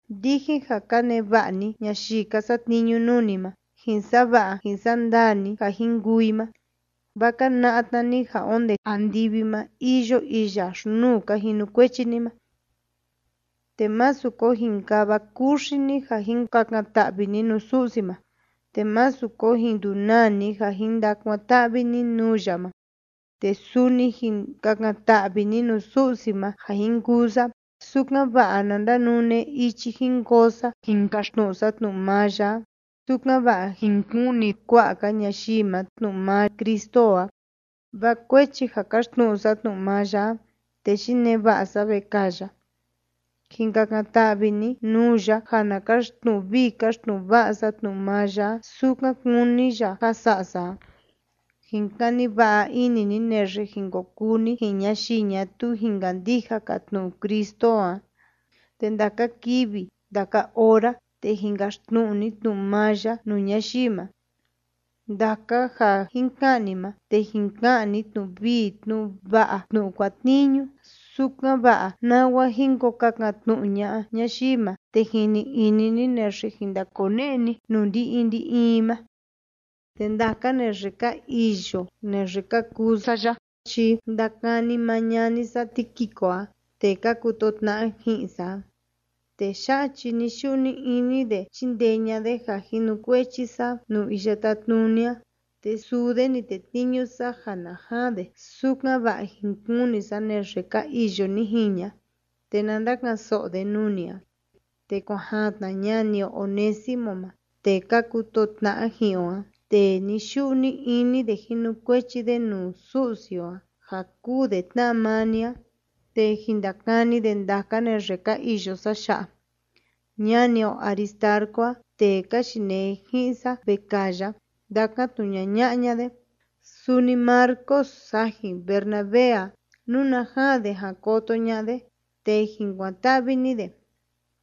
Ndijin ja ka neva'a ni ñayii ka satniñu nuu ni ma, jin sa'a va'a jin sa'a ndaa ni ja jin kuu i ma, vaa ka na'a tna ni ja onde andivi ma iyo iya xi‑nuu ka jinukuechi ni ma. Te másu ko jin kava kuxi ni ja jin kakan‑ta'vi ni nuu Su'si ma, te másu ko jin ndunaa ni ja jin ndakuan‑ta'vi ni nuu ya ma. Te suni jin kakan‑ta'vi ni nuu Su'si ma ja jin kuu sa, sukan‑va'a na ndanune ichi jin koo sa jin kaxtnu'u sa tnu'u maa ya a, sukan‑va'a jin kuni kua'a‑ka ñayii ma tnu'u maa Cristo o a. Vaa kuechi ja kaxtnu'u sa tnu'u maa ya a, te yinee va'a sa vekaa ya a. Jin kakan‑ta'vi ni nuu ya ja na kaxtnu'u vii kaxtnu'u va'a sa tnu'u maa ya a, sukan kúni ya ja sa'a sa a. Jin kani va'a ini ni naxe jin ko kuu ni ji'in ñayii ñatuu jin kandija‑ka tnu'u Cristo o a, te ndaka kivi ndaka ora, te jin kaxtnu'u ni tnu'u maa ya nuu ñayii ma. Ndaka ja jin ka'an ni ma, te jin ka'an ni tnu'u vii tnu'u va'a tnu'u kuatniñu, sukan‑va'a nawa jin ko kakan‑tnu'u ña'a ñayii ma, te jin ni'i ini ni naxe jin ndakone'e ni nuu ndi‑in ndi‑in i ma. Te ndaka naxe ka iyo naxe ka kuu sa ya chi ndakani maa ñani sa Tíquico a, tee ka kutoo tna'a ji'in sa a. Tee ya'a chi ni‑yu'u ni‑ini de chíndee ña'a de ja jinukuechi sa nuu Iya Tátnuni a. Te suu de ni tetniñu sa ja na jaan de, sukan‑va'a jin kuni sa naxe ka iyo ni jiña, te na ndaka'an‑so'o de nuu ni a. Te kuan jaan tna ñani o Onésimo ma, tee ka kutoo tna'a ji'in o a, tee ni‑yu'u ni‑ini de jinukuechi de nuu Su'si o a, ja kúu de tna'a maa ni a. Te jin ndakani de ndaka naxe ka iyo sa ya'a. Ñani o Aristarco a, tee ka yinee ji'in sa vekaa ya, ndakan‑tnu'u ñaña'a ña de. Suni Marcos sajin Bernabé a. Nuna jaan de jan koto ña'a de, te jin kuan‑ta'vi ni de,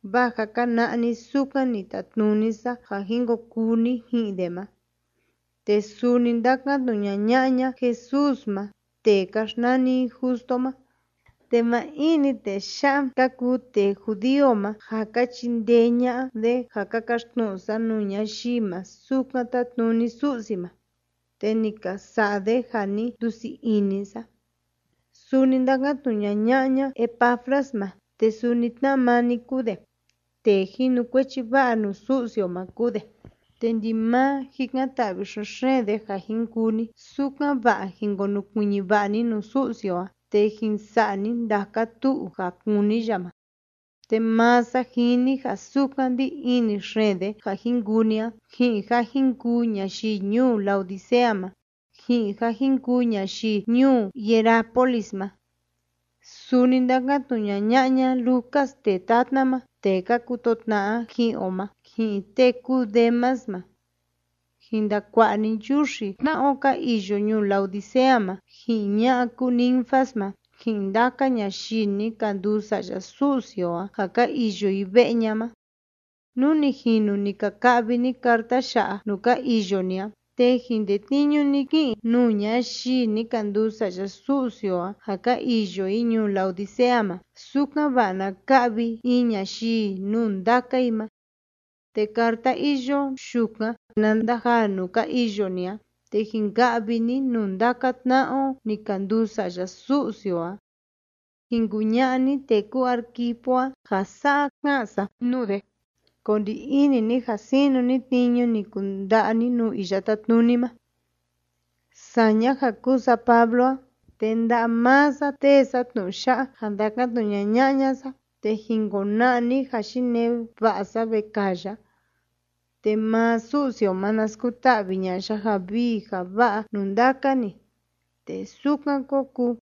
vaa jâ ka na'a ni sukan ni tatnuni sa ja jin ko kuu ni ji'in de ma. Te suni ndakan‑tnu'u ñaña'a ña Jesús ma tee ka xnani i Justo ma. Te maa in‑ni tee ya'a ka kuu tee judío ma ja ka chindee ña'a de ja ka kaxtnu'u sa nuu ñayii ma sukan tátnuni Su'si ma, te ni ka sa'a de ja ni ndusii ini sa. Suni ndakan‑tnu'u ñaña'a ña Epafras ma, te suni tna'a maa ni kúu de. Tee jinukuechi va'a nuu Su'si o ma kúu de, te ndimaa jikan‑ta'vi xen‑xeen de ja jin kuu ni, sukan‑va'a jin konukuiñi va'a ni nuu Su'si o a te jin sa'a ni ndaka tu'u ja kúni ya ma. Te maa sa jini ja sukan ndí ini xeen de ja jin kuu ni a, ji'in ja jin kuu ñayii ñuu Laodicea ma, ji'in ja jin kuu ñayii ñuu Hierápolis ma. Suni ndakan‑tnu'u ñaña'a ña Lucas tee tatna ma, tee ka kutoo tna'a ji'in o ma, ji'in tee kúu Demas ma. Jin ndakua'a ni nchuxi tna'a o ka iyo ñuu Laodicea ma, ji'in ña'a kúu Ninfas ma, ji'in ndaka ñayii ni ka nduu sa'ya Su'si o a ja ka iyo i ve'e ña ma. Nú ni jinu ni ka ka'vi ni carta ya'a nuu ka iyo ni a, te jin tetniñu ni kí'in nuu ñayii ni ka nduu sa'ya Su'si o a ja ka iyo i ñuu Laodicea ma, sukan‑va'a na ka'vi in ñayii nuu ndaka i ma. Te carta iyo yukan na ndajaa nuu ka iyo ni a, te jin ka'vi ni nuu ndaka tna'a o ni ka nduu sa'ya Su'si o a. Jin kuña'a ni tee kúu Arquipo a ja sa'a ká'an sa nuu de: “Ko ndi ini ni ja sinu ni tniñu ni kunda'a ni nuu Iya Tátnuni ma.” Saña ja kúu sa Pablo a, te nda'a maa sa tée sa tnu'u ya'a ja ndákan‑tnu'u ñaña'a ña sa, te jin kona'a ni ja yinee va'a sa vekaa ya. Te maa Su'si o ma, na skuta'vi ña'a ya ja vii ja va'a nuu ndaka ni. Te sukan kó kuu.